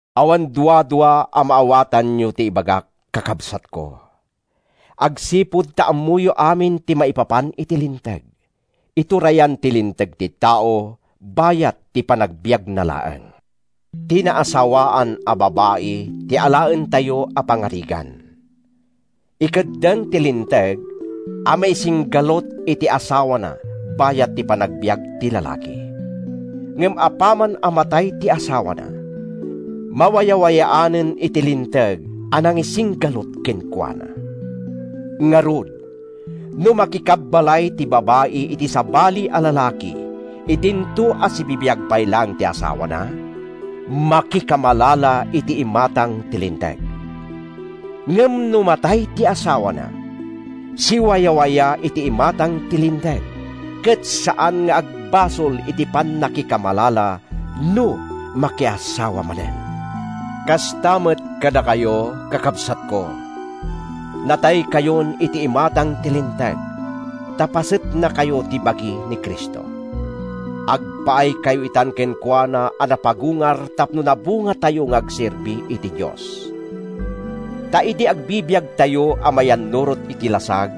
Awan duadua a maawatanyo ti ibagak, kakabsatko, agsipud ta ammoyo amin ti maipapan iti linteg. Iturayan ti linteg ti tao bayat ti panagbiagna laeng. Ti naasawaan a babai ti alaentayo a pangarigan. Ikeddeng ti linteg a maisinggalut iti asawana bayat ti panagbiag ti lalaki. Ngem apaman a matay ti asawana, mawayawayaanen iti linteg a nangisinggalut kenkuana. Ngarud, no makikabbalay ti babai iti sabali a lalaki idinto a sibibiag pay laeng ti asawana, makikamalala iti imatang ti linteg. Ngem no matay ti asawana, siwayawaya iti imatang ti linteg ket saan nga agbasol iti pannakikamalala no makiasawa manen. Kasta met kadakayo, kakabsatko. Nataykayon iti imatang ti Linteg, ta pasetnakayo ti bagi ni Cristo. Agpaaykayo itan kenkuana a napagungar tapno nabungatayo nga agserbi iti Dios. Ta idi agbibiagtayo a mayannurot iti lasag,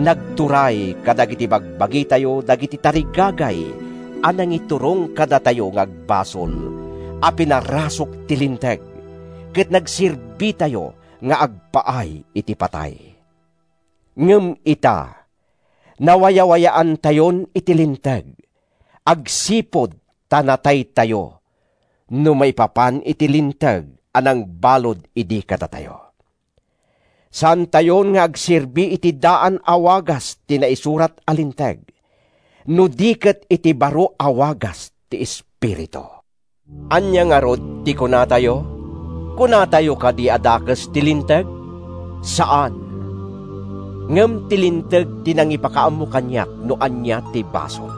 nagturay kadagiti bagbagitayo dagiti tarigagay a nangiturong kadatayo nga agbasol a pinarasuk ti Linteg ket nagserbitayo nga agpaay iti patay. Ngem ita, nawayawayaantayon iti Linteg, agsipud ta nataytayo—no maipapan iti linteg a nangbalud idi kadatayo. Saantayon nga agserbi iti daan a wagas ti naisurat a linteg, no di ket iti baro a wagas ti Espiritu. Ania ngarud ti kunatayo? Kunatayo kadi a dakes ti Linteg? Saan! Ngem ti Linteg ti nangipakaammo kaniak no ania ti basol.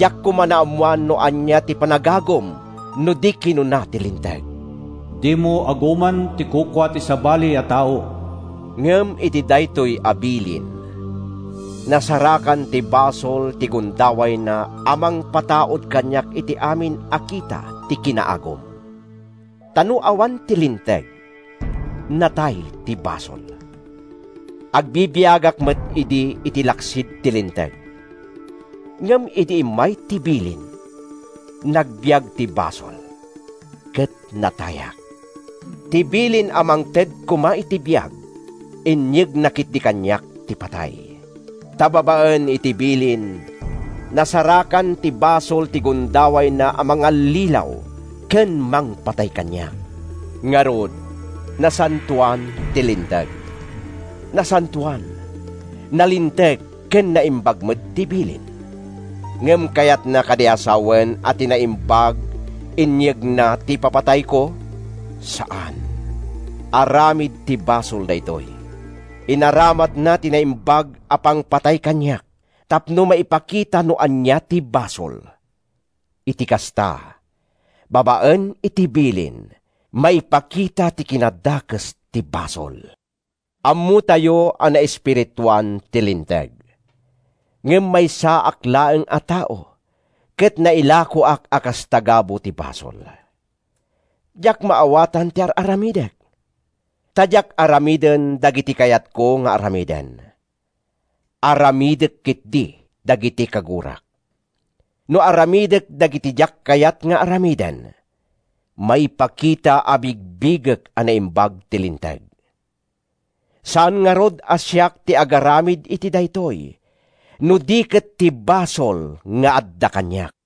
Diak koma naammoan no ania ti panagagum no di kinuna ti Linteg: “Dimo aguman ti kukua ti sabali a tao.” Ngem iti daytoy a bilin, nasarakan ti basol ti gundawayna a mangpataud kaniak iti amin a kita ti kinaagum. Ta no awan ti linteg, natay ti basol. Agbibiagak met idi iti laksid ti linteg. Ngem idi immay ti bilin, nagbiag ti basol ket natayak. Ti bilin a mangted koma iti biag, inyegna ketdi kaniak ti patay. Ta babaen iti bilin, nasarakan ti basol ti gundawayna a mangallilaw ken mangpatay kaniak. Ngarud, nasantoan ti Linteg. Nasantoan, nalinteg ken naimbag met ti bilin. Ngem kayatna kadi a sawen a ti naimbag inyegna ti ipapatayko? Saan! Aramid ti basol daytoy. Inaramatna ti naimbag a pangpatay kaniak tapno maipakita no ania ti basol. Iti kasta, babaen iti bilin, maipakita ti kinadakes ti basol. Ammotayo a naespirituan ti Linteg. Ngem maysaak laeng a tao, ket nailakoak a kas tagabu ti basol. Diak maawatan ti ar-aramidek. Ta diak aramiden dagiti kayatko nga aramiden. Aramidek ketdi dagiti kagurak. No aramidek dagiti diak kayat nga aramiden, maipakita a bigbigek a naimbag ti Linteg. Saan ngarud a siak ti agaramid iti daytoy, no di ket ti basol nga adda kaniak.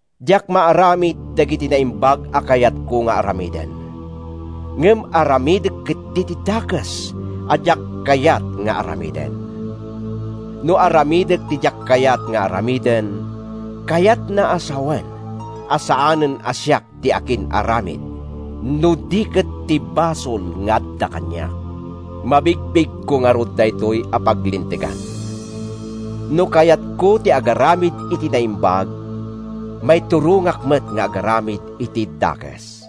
Diak maaramid dagiti naimbag a kayatko nga aramiden, ngem aramidek ketdi ti dakes a diak kayat nga aramiden. No aramidek ti diak kayat nga aramiden, kayatna a sawen a saanen a siak ti akin-aramid, no di ket ti basol nga adda kaniak. Mabigbigko ngarud daytoy a paglintegan: No kayatko ti agaramid iti naimbag, maiturongak met nga agaramid iti dakes.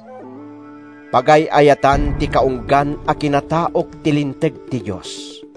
Pagay-ayatan ti kaunggan a kinataok ti linteg ti Dios.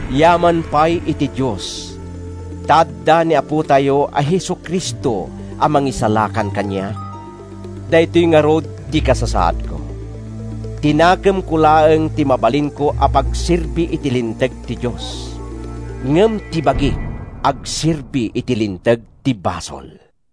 Yaman pay iti Dios, ta adda ni Apotayo a Jesu-Cristo a mangisalakan kaniak! Daytoy ngarud ti kasasaadko: Ti nakemko laeng ti mabalinko a pagserbi iti linteg ti Dios, ngem ti bagik, agserbi iti linteg ti basol.